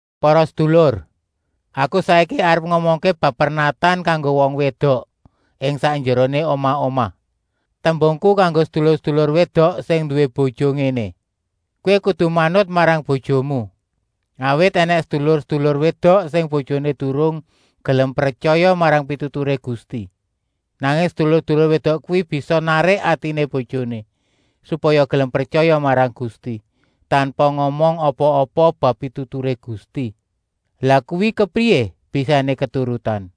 Para sedulur, aku saiki arep ngomongké bab pernatan kanggo wong wédok ing sakjeroné omah-omah. Tembungku kanggo sedulur-sedulur wédok sing nduwé bojo ngéné: “Kowé kudu manut marang bojomu. Awit ènèng sedulur-sedulur wédok sing bojoné durung gelem pretyaya marang pituturé Gusti. Nanging sedulur-sedulur wédok kuwi bisa narik atiné bojoné, supaya gelem pretyaya marang Gusti, tanpa ngomong apa-apa bab pituturé Gusti.” Lah kuwi kepriyé bisané keturutan?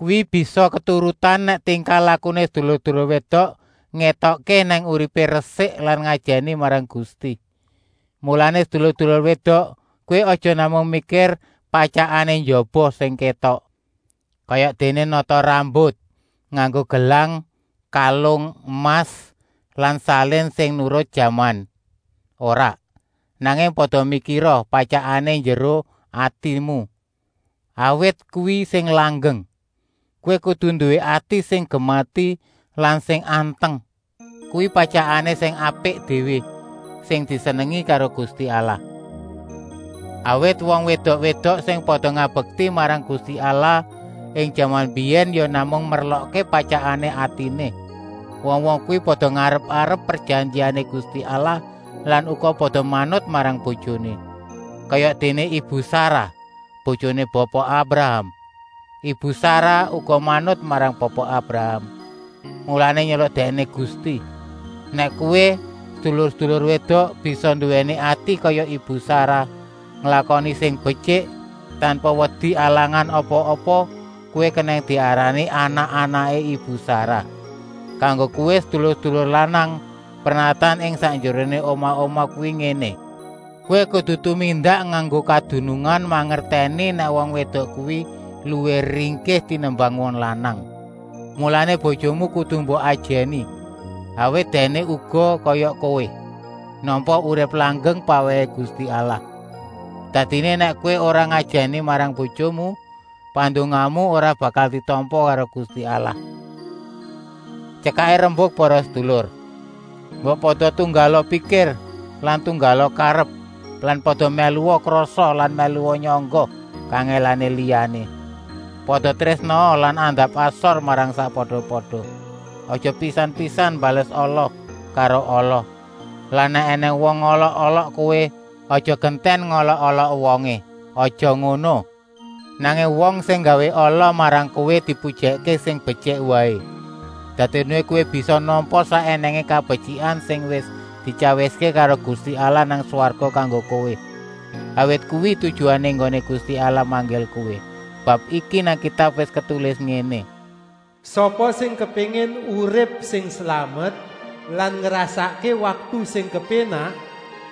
Kuwi bisa keturutan nèk tingkah-lakuné sedulur-sedulur wédok ngétokké nèk uripé resik lan ngajèni marang Gusti. Mulané sedulur-sedulur wédok, kowé aja namung mikir patyakané njaba sing kétok, kayadéné nata rambut, nganggo gelang-kalung emas lan salin sing nurut jaman, ora. Nanging pada mikira patyakané njeruh atimu, awit kuwi sing langgeng. Kowé kudu nduwé ati sing gemati lan sing anteng. Kuwi patyakan sing apik déwé, sing disenengi karo Gusti Allah. Awit wong wédok-wédok sing pada ngabekti marang Gusti Allah ing jaman mbiyèn ya namung merlokké patyakané atiné. Wong-wong kuwi pada ngarep-arep prejanjiané Gusti Allah lan uga pada manut marang bojoné. Kayadéné ibu Sarah, bojoné Bapa Abraham. Ibu Sarah uga manut marang Bapa Abraham, mulané nyeluk dèkné Gusti. Nèk kowé, sedulur-sedulur wédok, bisa nduwèni ati kaya ibu Sarah, nglakoni sing betyik, tanpa wedi alangan apa-apa, kowé kenèng diarani anak-anaké ibu Sarah. Kanggo kowé sedulur-sedulur lanang, pernatan ing sakjeroné omah-omah kuwi ngéné: Kowé kudu tumindak nganggo kadunungan, mangertèni nèk wong wédok kuwi luwih ringkih tenimbang wong lanang. Mulané bojomu kudu mbok ajèni, awit dèkné uga, kaya kowé, nampa urip langgeng pawèhé Gusti Allah. Dadiné, nèk kowé ora ngajèni marang bojomu, pandongamu ora bakal ditampa karo Gusti Allah. Tyekaké rembuk para sedulur, mbok pada tunggala pikir lan tunggala karep lan pada mèlua krasa lan mèlua nyangga kangèlané liyané. Pada trésnaa lan andap-asor marang sakpada-pada. Aja pisan-pisan mbales ala karo ala lan nèk ènèng wong ngolok-olok kowé, aja gentèn ngolok-olok wongé, aja ngono. Nanging wong sing nggawé ala marang kowé dipujèkké sing betyik waé. Dadiné kowé bisa nampa sak ènèngé kabetyikan sing wis dityawiské karo Gusti Allah nang swarga kanggo kowé, awit kuwi tujuané enggoné Gusti Allah manggil kowé. Bab iki nang Kitab wis ketulis ngéné: “Sapa sing kepéngin urip sing slamet lan ngrasakké waktu sing kepénak,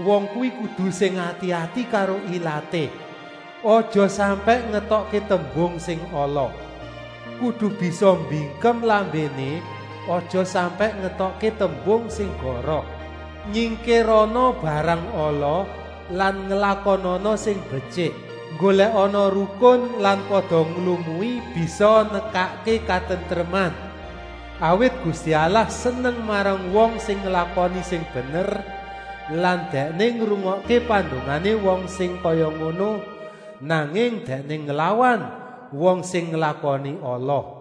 wong kuwi kudu sing ati-ati karo ilaté, aja sampèk ngetokké tembung sing ala. Kudu bisa mbingkem lambéné, aja sampèk ngetokké tembung sing goroh. Nyingkirana barang ala lan nglakonana sing betyik. Nggolèkana rukun lan pada nglumui bisa nekakké katentreman. Awit Gusti Allah seneng marang wong sing nglakoni sing bener lan Dèkné ngrungokké pandongané wong sing kaya ngono, nanging Dèkné nglawan wong sing nglakoni ala.”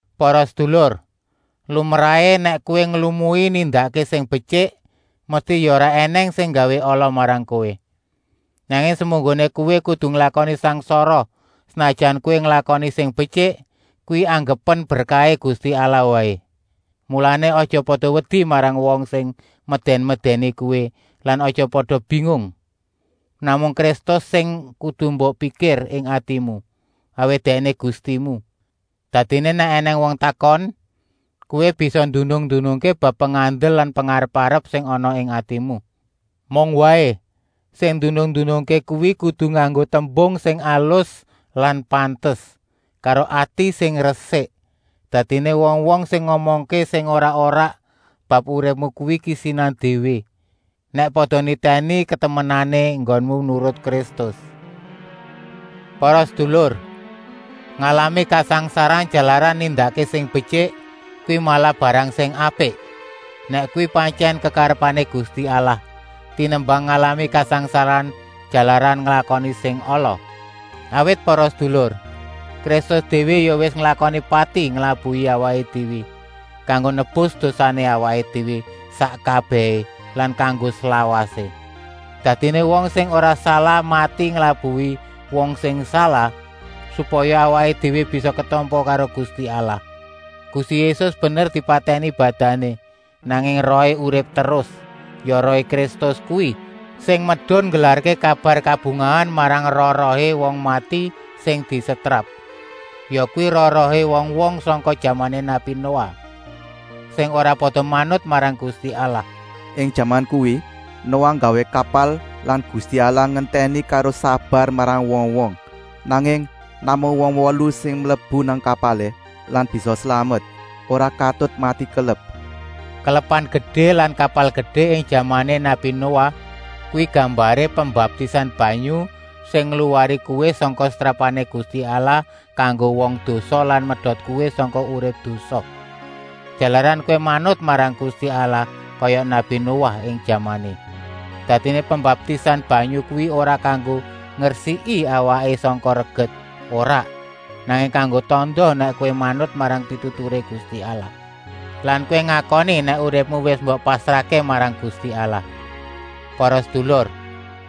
Para sedulur, lumrahé, nèk kowé nglumui nindakké sing betyik, mesti ya ora ènèng sing nggawé ala marang kowé. Nanging semunggoné kowé kudu nglakoni sangsara senajan kowé nglakoni sing betyik, kuwi anggepen berkahé Gusti Allah waé. Mulané, aja pada wedi marang wong sing medèn-medèni kowé lan aja pada bingung. Namung Kristus sing kudu mbok pikir ing atimu, awit Dèkné Gustimu. Dadiné nèk ènèng wong takon, kowé bisa ndunung-ndunungké bab pengandel lan pengarep-arep sing ana ing atimu. Mung waé, sing ndunung-ndunungké kuwi kudu nganggo tembung sing alus lan pantes, karo ati sing resik. Dadiné wong-wong sing ngomongké sing ora-ora bab uripmu kuwi kisinan déwé, nèk pada nitèni katemenané enggonmu nurut Kristus. Para sedulur, ngalami kasangsaran jalaran nindakké sing betyik kuwi malah barang sing apik, nèk kuwi pantyèn kekarepané Gusti Allah, tenimbang ngalami kasangsaran jalaran nglakoni sing ala. Awit para sedulur, Kristus déwé ya wis nglakoni pati nglabuhi awaké déwé, kanggo nebus dosané awaké déwé sak kabèhé lan kanggo slawasé. Dadiné wong sing ora salah mati nglabuhi wong sing salah, supaya awaké déwé bisa ketampa karo Gusti Allah. Gusti Yésus bener dipatèni badané, nanging rohé urip terus. Ya rohé Kristus kuwi sing medun nggelarké kabar kabungahan marang roh-rohé wong mati sing disetrap. Yakuwi roh-rohé wong-wong sangka jamané nabi Noah, sing ora pada manut marang Gusti Allah. Ing jaman kuwi Noah nggawé kapal lan Gusti Allah ngentèni karo sabar marang wong-wong, nanging namung wong wolu sing mlebu nang kapalé lan bisa slamet, ora katut mati kelep. Kelepan gedé lan kapal gedé ing jamané nabi Noah kuwi gambaré pembaptisan banyu sing ngluwari kowé sangka setrapané Gusti Allah kanggo wong dosa lan medot kowé sangka urip dosa, jalaran kowé manut marang Gusti Allah kaya nabi Noah ing jamané. Dadiné pembaptisan banyu kuwi ora kanggo ngresiki awaké sangka reget, ora, nanging kanggo tanda nèk kowé manut marang pituturé Gusti Allah lan kowé ngakoni nèk uripmu wis mbok pasrahké marang Gusti Allah. Para sedulur,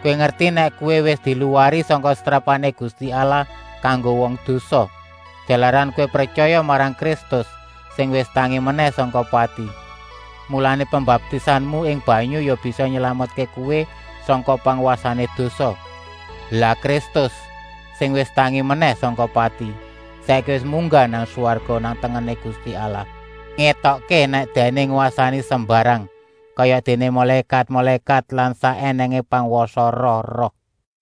kowé ngerti nèk kowé wis diluwari sangka setrapané Gusti Allah kanggo wong dosa, jalaran kowé pretyaya marang Kristus, sing wis tangi menèh sangka pati. Mulané pembaptisanmu ing banyu ya bisa nylametké kowé sangka pangwasané dosa. Lah Kristus, sing wis tangi menèh sangka pati, saiki wis munggah nang swarga nang tengené Gusti Allah, ngétokké nèk Dèkné ngwasani sembarang, kayadéné mulékat-mulékat lan sak ènèngé pangwasané roh-roh.